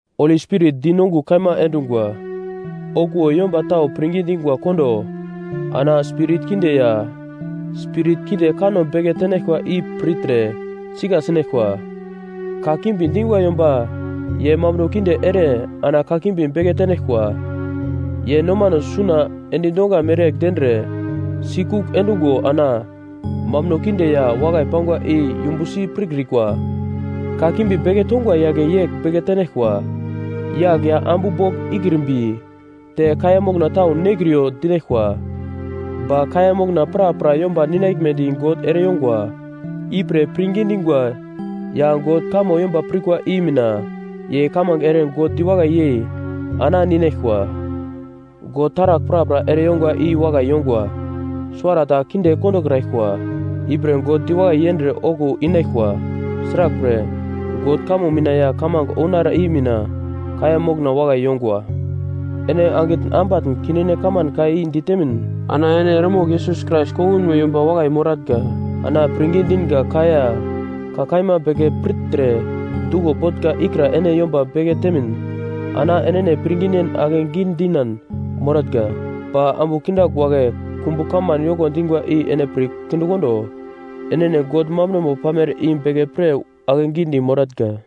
Holi Spirit dinongugl kaima endungwa, okuwo yomba tau pirngi dingwa kondo ana spirit kinde ya spirit kinde kanno beke tenaglkwa i pirtre sika sinaglkwa. Kakimbi dingwa yomba ye mambuno kinde ere ana kakimbi beke tenaglkwa. Ye nomano suna endi donga mereyegl dendre sikugl endungo ana mambuno kinde ya wakai pangwa i yumbusi pirkrikwa. Kakimbi beke tongwa yagle yegl beke tenaglkwa: Yagl ya ambu bogl ikrimbi, te kaiya mokna tau nekriyo dinaglkwa. Ba kaiya mokna prapra yomba ninaglmedi God ereyongwa. Ipre pirngi dingwa ya God kamo yomba pirkwa i mina ye kamange ere God diwakai yei ana ninaglkwa. God taragl prapra ere yongwa i wakai yongwa, suwara ta kinde kondokraglkwa. Ipre God diwakai yendre okuwo inaglkwa. Sraglpre, God kamo mina ya kamange ounara i mina kaiya mokna wakai yongwa. Ene angitn ambatn kindine kaman ka i ditemin, ana ene eremogl Yesus Krais kongunmo yomba wakai moratnga. Ana pirngi dinga ka ya ka kaima beke pirtre duglo botnga ikra ene yomba beke temin ana enene pirnginen akegi dinan moratnga. Ba ambu kindagl wagle kumbu kaman yoko dingwa i ene pir kindekondo. Enene God mambunomo pamere i beke pir ake gidi moratnga.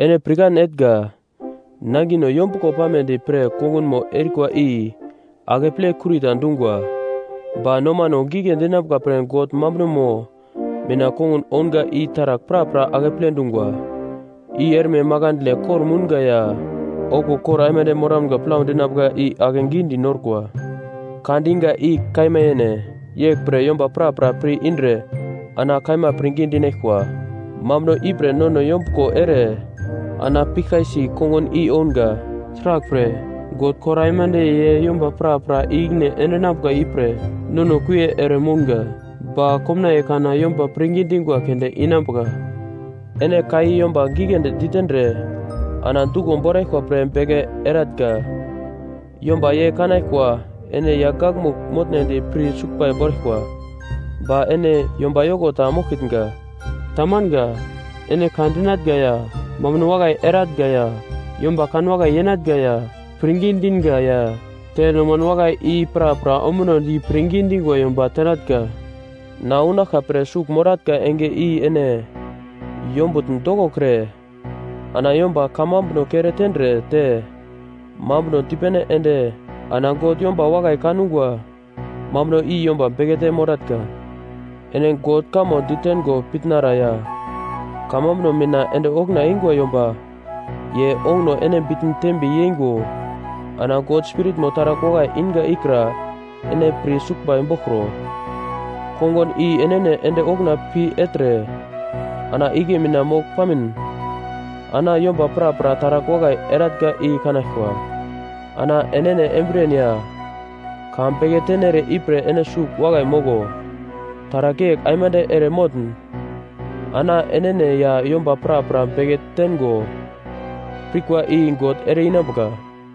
Ene pirkan etnga: Nangino yombuglo panambedi pre kongunmo erikwa i akeple kurita dungwa. Ba nomano gigle dinambuka pre God mambunomo mina kongun ounga i taragl prapra akeple dungwa, i erme makandle kor-mounga ya okuwo kor aimande moramga plau dinambuka i akegi norkwa. Ka diga i kaima yene. Yeglpre yomba prapra pir-indre ana kaima pirngi dinaglkwa. Mambuno ipre nono yombuglo ere ana piglkai-si kongun i ounga. Sraglpre, God kor aimande ye yomba prapra i-ikine endinambuka ipre nono kuie eremounga, ba komnaiye kana yomba pirngi dingwa keunde inambuka. Ene ka i yomba giglendi ditendre ana duglo boraglkwa pre beke erenatnga. Yomba ye kanaglkwa ene yagl gakmugl motnedi pir suglbai boraglkwa, ba ene yomba yoko ta moglkitnga. Tamanga. Ene ka dinatnga ya mambuno wakai eratnga ya yomba kanwakai yenatnga ya pirngi dinga ya te noman wakai, i prapra ombunodi pirngi dingwa yomba tenatnga. Na unaglka pre sugl moratnga enge i ene yombutn dokokre ana yomba kamambuno kere tendre te mambuno dipene ende ana God yomba wakai kangwa mambuno i yomba bekete moratnga. Ene God kamo ditengo pitnara ya kamambuno mina ende okuna eingwa yomba. Ye onguno ene bitn tembe yeingo ana God Spiritmo taragl wakai inga ikra ene pir suglbai boglkro. Kongun i enene ende okuna pi ertre, ana igle mina mogl pamin ana yomba prapra taragl wakai eratnga i kanaglkwa. Ana enene embriyen ya ka beke tenere ipre ene sugl wakai moglo. Taragl yegl aimande ere motn ana enene ya yomba prapra beke tengo pirkwa i God ere-inambuka.